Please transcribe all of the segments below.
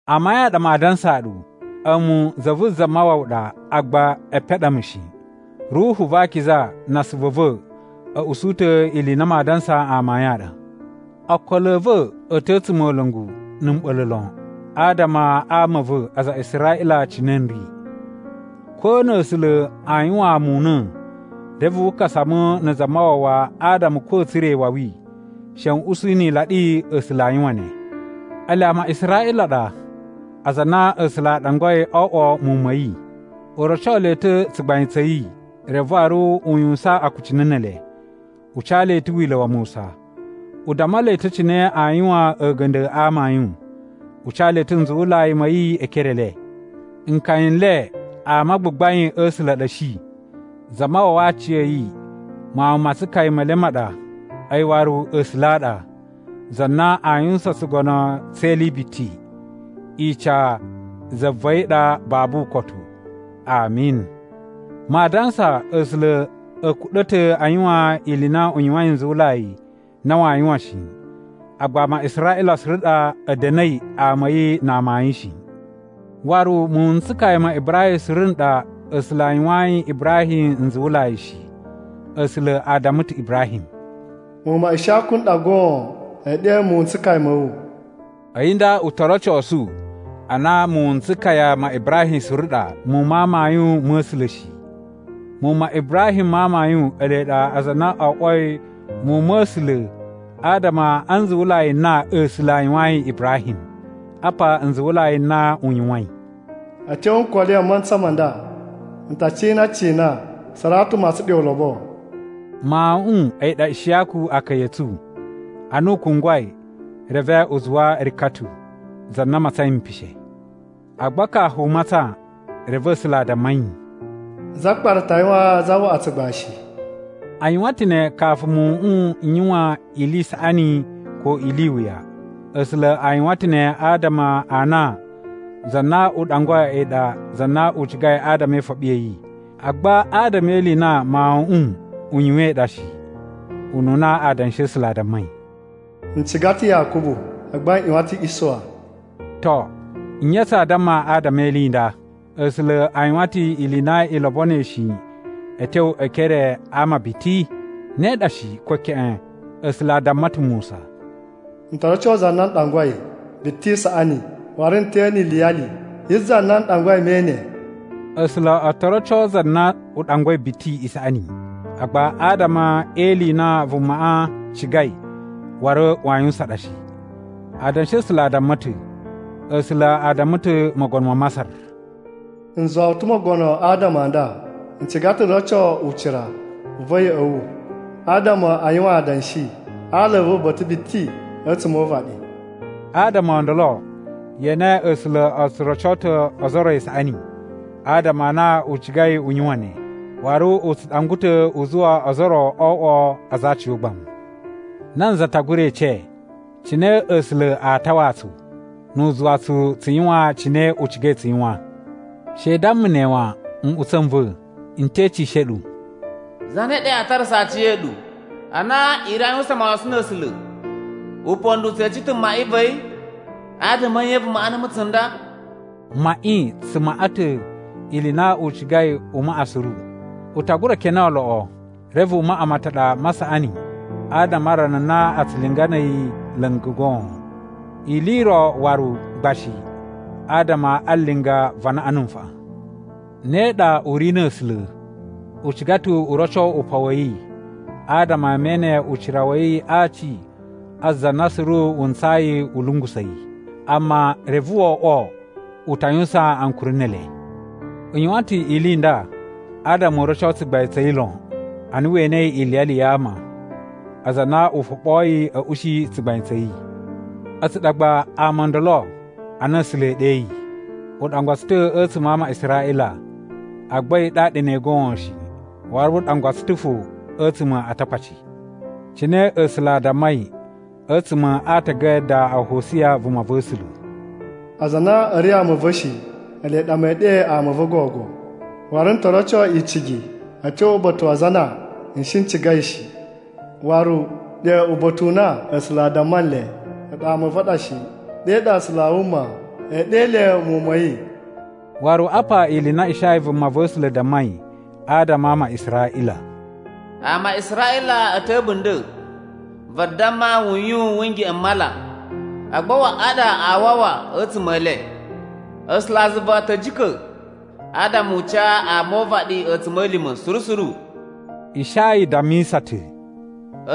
Amayun a ɗa maa dansaa ɗu. A̱mu za vu Zamawawa ɗa agba epen a ɗa mu shi. Ruhu va Akiza na asuvu a̱ va̱ a̱ usu ta̱ ili i na maa dansa amayun a ɗa. Okolo a̱ va̱ a̱ ta̱ a̱tsumola̱ngu na̱ mɓa̱la̱ lon adama a ama a̱ va̱, aza a Israꞌila cine n ri. Ko na̱ A̱sula̱ aa yuwaan mu una̱ reve wu kasa mu na̱ Zamawawa adama ko a̱a̱ tsura̱ iwawi, she n usu ni ilaɗi A̱sula̱ a yuwan ne. Ele ama a Israꞌila a ɗa, aza a na A̱sula̱ a ɗangwai o oꞌwo muwun ma̱ yi, u roco le ta̱ tsugbain tsa̱ yi, reve waru u yuwusan akucunu ne ele. U ca le ta̱ Wila̱ wa Musa. U damma le ta̱ cine aa yuwan a̱ga̱nda̱ a amayun. U ca le ta̱ nzuwulai ma̱ yi e ekere e le. Nkaya n le ama a gbagbain a̱ A̱sula̱ a ɗa a̱ shi, Zamawawa a aciya̱yi mawun ma tsukaya me le ma ɗa. A̱yi waru A̱sula̱ a ɗa, za na aa yuwusan tsugono tse ili i biti! Ica za va̱ yi ɗa babu ukotu! Ami. Maa dansa A̱sula̱ a̱ kuɗa̱ ta̱ a yuwan ili i na u yuwain nzuwulai na waa yuwan shi. Agba ama a Israꞌila suru ɗa a̱ da̱na̱i ama a̱ yi na amayun shi. Waru muwun n tsukaya ma Ibrahim suru n ɗa A̱sula̱ a yuwayin Ibrahim nzuwulai shi. A̱sula̱ a damma ta̱ Ibrahim, “Muwun ma Ishiyaku n ɗa goon e ɗe muwun n tsukaya ma̱ wu.” A̱yi nda u to rocosu a na muwun n tsukaya ma Ibrahim suru ɗa muwun ma amayun ma̱ A̱sula̱ shi. Muwun ma Ibrahim ma amayun ele ɗa aza a na o oꞌwoi muwun ma̱ A̱sula̱ adama a nzuwulai n na A̱sula̱ a yuwayin Ibrahim. Apa nzuwulai n na u yuwain: “A̱ tyo nkoli a mantsa ma nda, n ta cina cina Saratu matsan ɗe ulobo.” Mawuꞌun a̱yi ɗa Ishiyaku akaya a̱ tsu. Ana u kungwai, reve u zuwa Rikatu, za na matsain mpishe. Agba kafu u matsan reve A̱sula̱ a damma yi, “Zakpara ta yuwaan zawaꞌa tsugbashi.” A yuwan ta̱ ne kafu muwuꞌun n yuwan ili i saꞌani ko ili i wuya. A̱sula̱ a yuwan ta̱ ne adama a na za na u ɗangwai a̱yi ɗa za na u cigai adama e ifoɓi ya̱ yi, agba adama e ili i na mawuꞌun u yuwain ɗa shi. Ununa Adanshi a̱ A̱sula̱ a dammai, “N ciga ta̱ Yakubu, agba n ꞌyuwan ta̱ Isuwa.” To, nye tsa damma adama e ili i nda? A̱sula̱ a yuwan ta̱ ili i na i lobonoi shi a̱ tyo e ekere a ama biti? Ne ɗa shi, ko keꞌen! A̱sula̱ a damma ta̱ Musa, “N to roco za na n ɗangwai biti isaꞌani, waru n te ene iliyali yi za na n ɗangwai me ene.” A̱sula̱ o to roco za na u ɗangwai biti isaꞌani, agba adama e ili i na vumaꞌa cigai waru waa yuwusan ɗa shi. Adanshi a̱ A̱sula̱ a damma ta̱, A̱sula̱ a damma ta̱ mogono ma Masar, “N zuwa wu ta̱ mogono adama a nda: N ciga ta̱ n roco ucira u va̱ ya̱ꞌa̱ wu, adama a yuwan adanshi a ala a̱ va̱ uba̱ta̱ biti a̱tsuma̱ o uvaɗi.” Adama o ndolo ye ene, A̱sula̱ o tsu roco ta̱ ozo o ro isaꞌani adama a na u cigai u yuwan ne, waru u tsu ɗangwa ta̱ u zuwa ozo o ro o oꞌwo aza a aciyogbamu. Nanza ta gura ece, “Cine A̱sula̱ a tawaa tsu, nu u zuwa tsu tsu yuwan cine u cigai tsu yuwan?” She i damma ne wan! Nꞌutsa̱ n va̱, n te ecishe ɗu, “Zane ɗa yaa tarasa aciya̱ɗu a na i ri aa yuwusan mawasan na̱ A̱sula̱? Upondo u tse ece ta̱ maꞌi va̱ yi, ‘Adama a̱ nye vu maꞌa numu tsunda?’” Maꞌi tsu maꞌa ta̱ ili i na u cigai u maꞌa suru. U ta gura kene oloꞌo reve u maꞌa mataɗa ma saꞌani adama a rana na a tsu linga na̱ a̱yi la̱nga̱ goon, ili i ro waru gba shi adama a linga va anaꞌan na̱ nfaꞌan. Ne ɗa u ri na̱ A̱sula̱. U ciga ta̱ u roco upan wa̱ yi adama ama e ene ucira wa̱ yi a aci a za na suru wu ntsayi a̱ lungusa̱ yi. Amma reve wo oꞌwo u ta yuwusan ankuri ne ele. U yuwan ta̱ ili i nda adama u roco tsugbain tsa̱ yi lon ana we enei iliyali ya ama, aza a na u foɓoyi a̱ ushi tsugbain tsa̱ yi. A̱tsu ɗa gba ama o ndolo a na A̱sula̱ e ɗeyi. U ɗangwa tsu ta̱ a̱tsuma̱ a ama a Israꞌila, agba a̱yi ɗaɗa ne goon shi, waru u ɗangwa tsu ta̱ fo a̱tsuma̱ a Atakpaci. Cine A̱sula̱ a dammai a̱tsuma̱ a aatagada a Hosiya, vumava̱sula̱: “Aza a na a̱ ri ama a̱ va̱ shi, Ele ɗa mee ɗe ama a̱ va̱ gogo. Waru n to roco icigi a̱ tyo uba̱ta̱ wa aza a na n shi n cigai shi.” Waru “Ɗe uba̱ta̱ u na A̱sula̱ a damma nle, ‘A̱ɗu ama a̱ va̱ a ɗa shi,’ Ɗe ɗa A̱sula̱ a wuma ee ɗe le muwun ma̱ yi.” Waru apa ili i na Ishaya vumava̱sula̱ dammai adama a ama a Israꞌila: “Ama a Israꞌila a̱ ta̱ a̱bunda̱, vadamma wuyun wu ngeꞌen m mala, agba waꞌa ɗa aa wawa a̱tsuma̱ e le. A̱sulazuva a̱ ta̱ jika̱, adama u ca ama o uvaɗi a̱tsuma̱lima̱ suru suru.” Ishaya dammisa ta̱: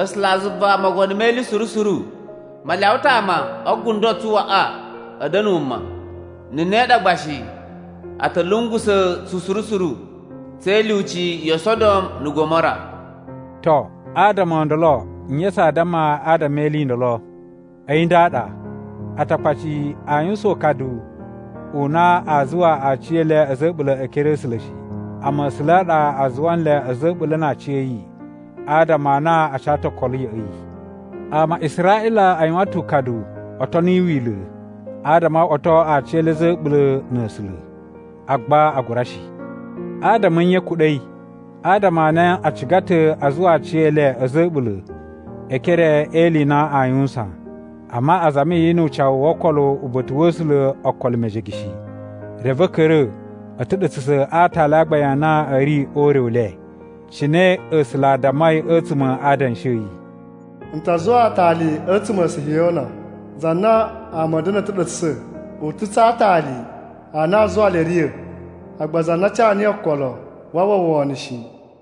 “A̱sulazuva Mogono me Ili Suru Suru ma lyawa ta̱ ama o gundo tsu waꞌa a̱ da̱na̱ wuma. Na̱ ne ɗa gba shi, a̱ ta̱ lungusa̱ tsu suru suru, tse ilyuci yo Sodom na̱ Gomora.” To, adama o ndolo nye tsaa damma adama e ili i ndolo? A̱yi nda ɗa: Atakpaci a yuwusan ukadu u na a zuwa aciyele a̱za̱ a̱ a̱ɓula̱ e ekere a̱ A̱sula̱ shi, amma A̱sula̱ a ɗa a zuwa nle a̱za̱ a̱ a̱ɓula̱ na aciya̱yi adama a na a ca ta̱ okolo ya̱ꞌa̱ yi. Ama a Israꞌila a yuwan ta̱ ukadu o toni Wila̱ adama o oꞌwoto aciyele a̱za̱ a̱ a̱ɓula̱ na̱ A̱sula̱. Agba a gura shi. Adama a̱ nye a̱ kuɗa̱i? Adama a na a ciga ta̱ a zuwa aciyele a̱za̱ a̱ a̱ɓula̱ e ekere e ili i na aa yuwusan, amma a zami yi nu ucawu wo okolo uba̱ta̱ wa̱ A̱sula̱ okolo mejege shi. Reve a̱ ka̱ra̱ a̱ ta̱ɗa̱tsa̱sa̱ a aatali a gbain a na a̱ ri o ure u le. Cine A̱sula̱ a dammai a̱tsuma̱ a Adanshi a̱ yi: “N ta zuwa aatali a̱tsuma̱ a Sihiyona. Za na ama a̱a̱ da̱na̱ a̱ ta̱ɗa̱tsa̱sa̱. U ta̱ tsa aatali a na aa zuwa le a̱ riya̱. Agba za na ca niyi okolo waa uwwa wono shi.”